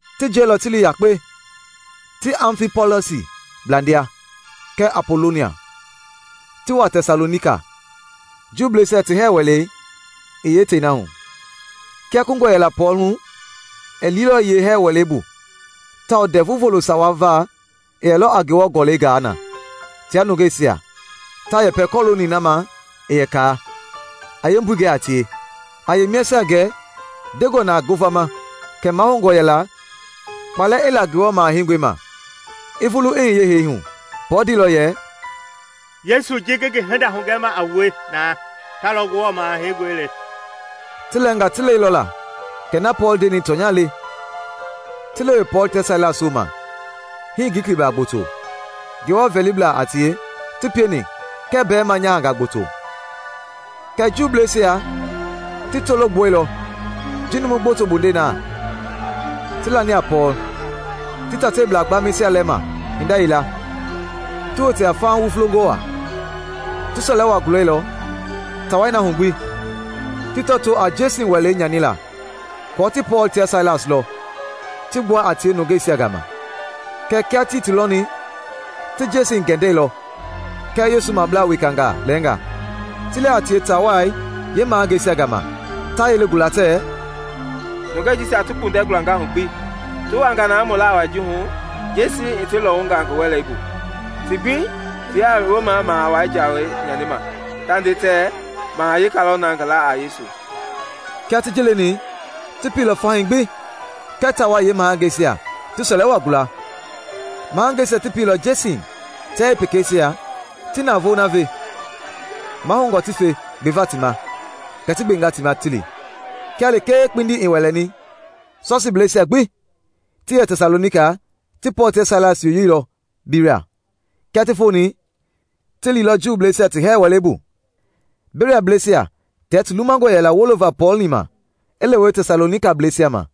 Ti jiɛilɔ ti li yakpe ti Amfipɔlis blandia kɛɛ Apolonia, ti wa Tɛsalonika, Juuisia ti hɛɛ wɛlei i yeetei na hu. Kia kungɔ yɛla Pɔɔl hu, i liilɔ yeehɛɛ wɛlei bu tawao Ndɛvu Volo sawa va i yɛlɔ a Ngewɔ Gɔlɛi gaa na tia nungeisia ta yɛpɛ kɔlooni na ma i yɛ kaa, a yeembui gɛ a tie, a yeemiasia gɛ ndengɔ na ngovama kɛ mahoungɔ yɛla kpalɛ i la Ngewɔ Maha Heingɔi ma, i vulu i hiye hee hu. Pɔɔl ndeilɔ yɛ, “Yesu ji ngi ngi hinda hugɛma a wue na, ta lɔ Ngewɔ Maha Heingɔi le.” Ti lɛɛngaa ti lɛilɔ la kɛ na Pɔɔl ndeni tɔnya le, ti lewe Pɔɔl tia Sailas wooma; hii Glikiblaa gboto, Ngewɔ vɛliblaa a tie, ti pieni kɛɛ mbɛɛma nyahangaa gboto. Kɛɛ Juuisia ti tolo gbuɛilɔ ji numu gboto bondei na ti lani a Pɔɔl, ti taitaiblaa gbaamɛisia lɛma hinda yila ti wote a faha wufulongɔ waa. Ti sɔlɛ waa gulɛilɔ taa wai hu gbi, ti tɔtoo a Jeesin wɛlei nyanila aako ti Pɔɔl tia Sailas lɔ, ti gbua a tie nungeisia gama. Kɛɛ kia tii ti lɔni, ti Jeesin gɛndɛilɔ kɛɛ Yesu mablaa wekangaa lɛɛnga ti li a tie taa wai yeemahangeisia gama ta yelei gula tɛɛ, “Nungɛi jisia ti kpundɛ gulanga hu gbi! Ti wanga na mu laa wai ji hu, Jeesin i ti lɔwunga ngi wɛlei bu. Ti gbi tiaa Rom Maha Wai jaweisia nyanima, ta nde tɛɛ maha weka lɔ na ngi laa a Yesu.” Kia ti ji leni, ti pieilɔ fahii gbi kɛɛ taa wai yeemahangeisia ti sɔlɛ waa gula. Mahangeisia ti pielɔ Jeesin tia yeepekeisia ti navoei na ve mahoungɔ ti fe gbeva ti ma, kɛ ti gbenga ti ma ti li. Kia lekee kpindi i wɛlɛni, Sɔsiibleisia gbi ti yɛ Tɛsalonika ti Pɔɔl tia Sailas yoyeilɔ Beria. Kia ti foni, ti liilɔ Juuisia ti hɛɛ wɛlei bu. Beriablɛisia tia ti lumangɔ yɛla wolova Pɔɔl-ni ma i lewe Tɛsalonikablɛisia ma.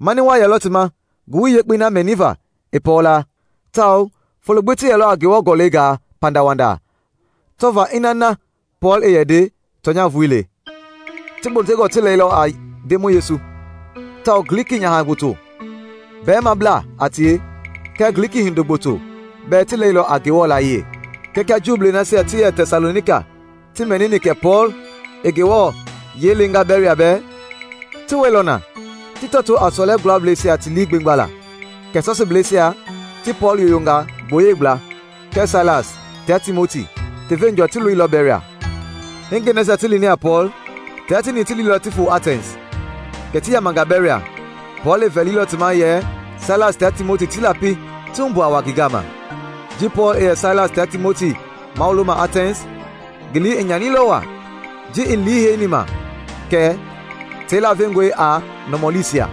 Mani wa yɛlɔ ti ma Ngowili Yekpei na mɛniva i Pɔɔl laa, tawao folo gbi ti yɛlɔ a Ngewɔ Gɔlɛi gaa pandawanda tɔvaa ina na Pɔɔl i yɛ nde tɔnya vulii le. Ti gbotongɔ ti lɛilɔ a Ndemɔi Yesu, tawao Gliki nyaha gboto, mbɛɛmablaa a tie kɛɛ Gliki hindo gboto bɛɛ ti lɛilɔ a Ngewɔ layiɛi. Kɛɛ kia Juu nasia ti yɛ Tɛsalonika ti mɛnini kɛ Pɔɔl i Ngewɔ yiɛi lenga Beria bɛɛ, ti wɛilɔ na ti tɔtoo a sɔlɛ gulablɛisia ti lii gbemgbala. Kɛ Sɔsiibleisia ti Pɔɔl yoyonga gboyei gbla, kɛɛ Sailas tia Timoti ti veenjɔɔ ti loilɔ Beria. Hingɛi nasia ti lini a Pɔɔl, tia tieni ti liilɔ ti foo Atɛns. Kɛ ti yamanga Beria, Pɔɔl i vɛli ti ma yɛ Sailas tia Timoti ti lapi ti humbu a wa ngi gama. Ji Pɔɔl i yɛ Sailas tia Timoti mawuloma Atɛns, ngi lii i nyanilɔ waa ji i liiheini ma kɛ tei lavengɔe a nɔmɔliisia.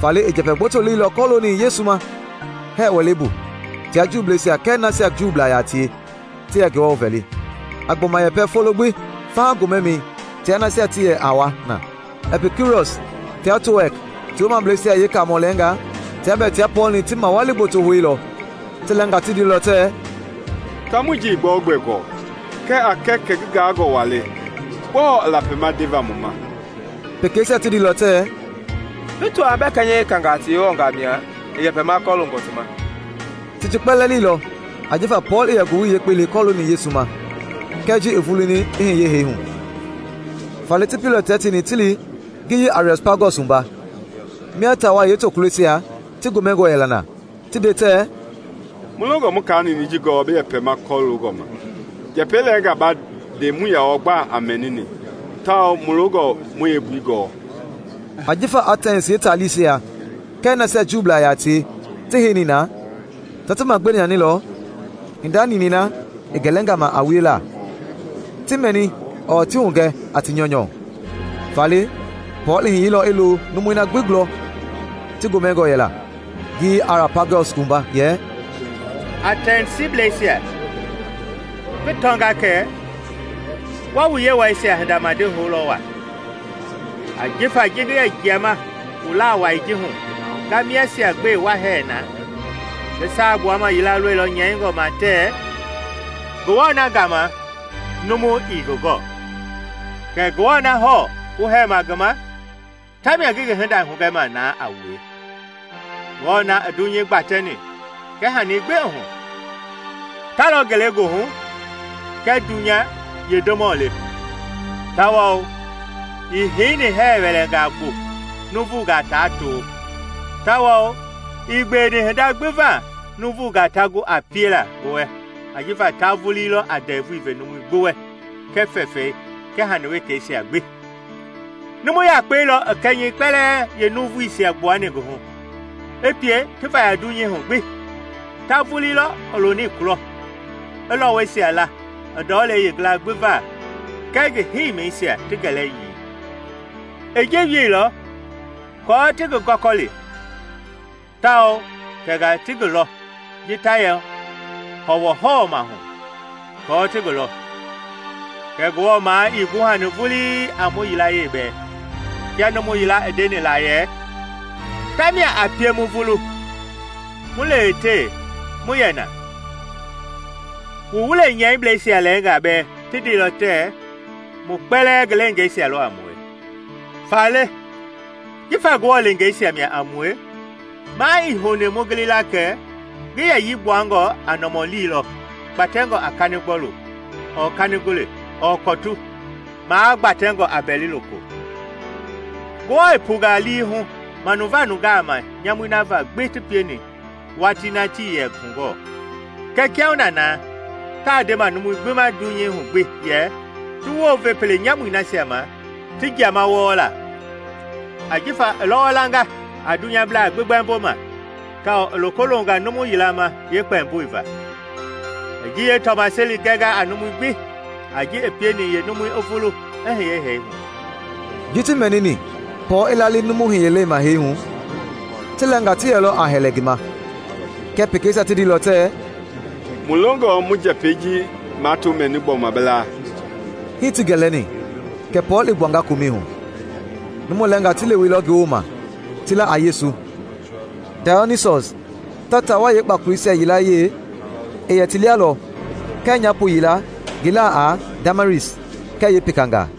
Faale ti njɛpɛ gboto leilɔ kɔlooni Yesu ma hɛɛ wɛlei bu tia Juuisia kɛɛ nasia Juublaa yaa tie ti yɛ Ngewɔ vɛli, a gbɔma yɛpɛ folo gbi faha gomɛmɛi tia nasia ti yɛ a wa na. Ɛpikiurɔs tia Toɛk ti woomableisia yeekaamɔ lɛɛngaa tia bɛɛ tia Pɔɔl-ni ti mawali gboto houilɔ. Ti lɛɛngaa ti ndeilɔ tɛɛ, “Taamɔi ji ii gbɛogbɛ gɔɔ kɛɛ a kɛ kɛ ngi gaangɔ waa le; gbɔɔ i lapima ndeva mu ma?” Pekeisia ti ndeilɔ tɛɛ, “Bi tɔaa bɛɛ kɛnyɛ wekangaa ti yewɔngaa mia i yɛpɛma kɔloongɔ ti ma.” Ti ji kpɛlɛɛ leilɔ ajifa Pɔɔl i yɛ Ngowili Yekpei le kɔlooni Yesu ma kɛɛ ji i vuluni i hiye hee hu. Faale ti pieilɔ tia tieni ti li ngiyei Ariɔpagɔs wumba, mia taa wai yeetokuloisia ti gomɛngɔ yɛla na ti nde tɛɛ, “Mu longɔ mu kaa ninɛi ji gɔɔ bi yɛpɛma kɔlooni ma. Njɛpɛi lɛɛnga ma mɛni ba nde muii yaa wɔɔ gba mɛnini tawao mu longɔ mu yeembui gɔɔ.” (Ajifa Atɛns yeetaalisia kɛɛ nasia Juublaa yia tie ti heini na ta ti magbewe nyanilɔ hinda ninɛi na i gɛlɛnga ma a wiela, ti mɛni ɔɔ ti hugɛ a ti nyɔunyɔ.) Faale Pɔɔl i hiyeilɔ i lo numui na gbi gulɔ ti gomɛngɔ yɛla Ngiyei Ariɔpagɔs wumba yɛ, “Atɛnsiblɛsisia! Ngi tɔnga kɛ wa wu yewɔɛisia hinda madi houlɔ waa. Ajifa ji ngi yɛ jiama wu laa wai ji hu nga miasia gbe wa hɛɛ na, ngi saa gbuama yila lɔilɔ nyɛingɔ ma tɛɛ, ‘Ngewɔ na gama numu ii ngi gɔɔ.’ Kɛ Ngewɔ na hɔɔ wu hɛɛma ngi ma tamia ngi ngi hinda hugɛma na a wue. Ngewɔ na i dunyei gbatɛni kɛɛ hani gbi i hu, ta lɔ ngelegoohu kɛɛ dunya yee Ndemɔ le, tawao ii heini hɛɛ wɛlɛngaa bu nuuvungaa ta to. Tawao ii gbeweni hinda gbi va nuuvungaa ta gu a piela ngi wɛ ajifa ta vulii lɔ a ndɛvui ve numui gbi wɛ kɛɛ fɛfɛi kɛɛ hani wekeisia gbi. Numu yakpei lɔ i kɛnyɛi kpɛlɛɛ yeenuvuisia gbuani ngi hu, i pie ti vaya dunyei hu gbi. Ta vulii lɔ i loni kulɔma i lɔwɔisia la i ndɔlei yeengila gbi va kɛɛ ngi heimisia ti gɛlɛyii. I ji wieilɔ aako ti ngi gɔkɔli, tawao tɛngaa ti ngi lɔ ji ta yɛ hɔwɔhɔwɔmahu aako ti ngi lɔ. Kɛɛ Ngewɔ maa ii guhani vulii a mu yilayee bɛɛ; Kia numu yila i ndeni la yɛ: ‘Tamia a pie mu vulu, mu lewetewe, mu yɛ na.’ Wu wule nyɛiblɛisia lɛɛngaa bɛɛ ti ndeilɔ tɛɛ, ‘Mu kpɛlɛɛ ngi leengeisia lɔ a mue.’ Faale jifa Ngewɔ leengeisia mia a mue maa ii houni mu gili la kɛ ngi yɛyii gbuangɔ a nɔmɔli lɔ kpatɛngɔ a kanigbɔlu ɔɔ kanigole ɔɔ kɔtu, magbatɛngɔ a mbɛli-loko. Ngewɔ i punga lii hu manuva nungaa ma nyamui na va ti pieni watii na tii yɛ hugɔɔ, kɛɛ kiahuna na taa ndema numui gbi ma dunyei hu gbi yɛ ti wounve pele nyamui nasia ma ti jiama wɔɔ la. Ajifa i lɔwɔ langa a dunyablaa gbi gbɛmbo ma tawao i loko longa numu yila ma yeekpɛmboi va. I ji yeetɔmaseli gɛnga a numui gbi a ji i pieni yeenumui i vulu i hiye hee hu!” Ji ti mɛnini Pɔɔl i lali numu hiyelei ma hee hu, ti lɛɛnga ti yɛlɔ a hɛlɛ ngi ma, kɛɛ pɛkɛisia ti ndeilɔ tɛɛ, “Mulongɔe mu njɛpɛi ji mato mɛni gbɔma bi laa.” Hii ti gɛlɛni kɛ Pɔɔl i gbuanga komɛi hu. Numu lɛɛngaa ti leweilɔ ngi wooma ti la a Yesu; Dayɔnisɔs, taa wai yeekpakoloisia yilayee, i yɛ ti lia lɔ kɛɛ nyaapo yila ngi laa a Damaris kɛɛ pekangaa.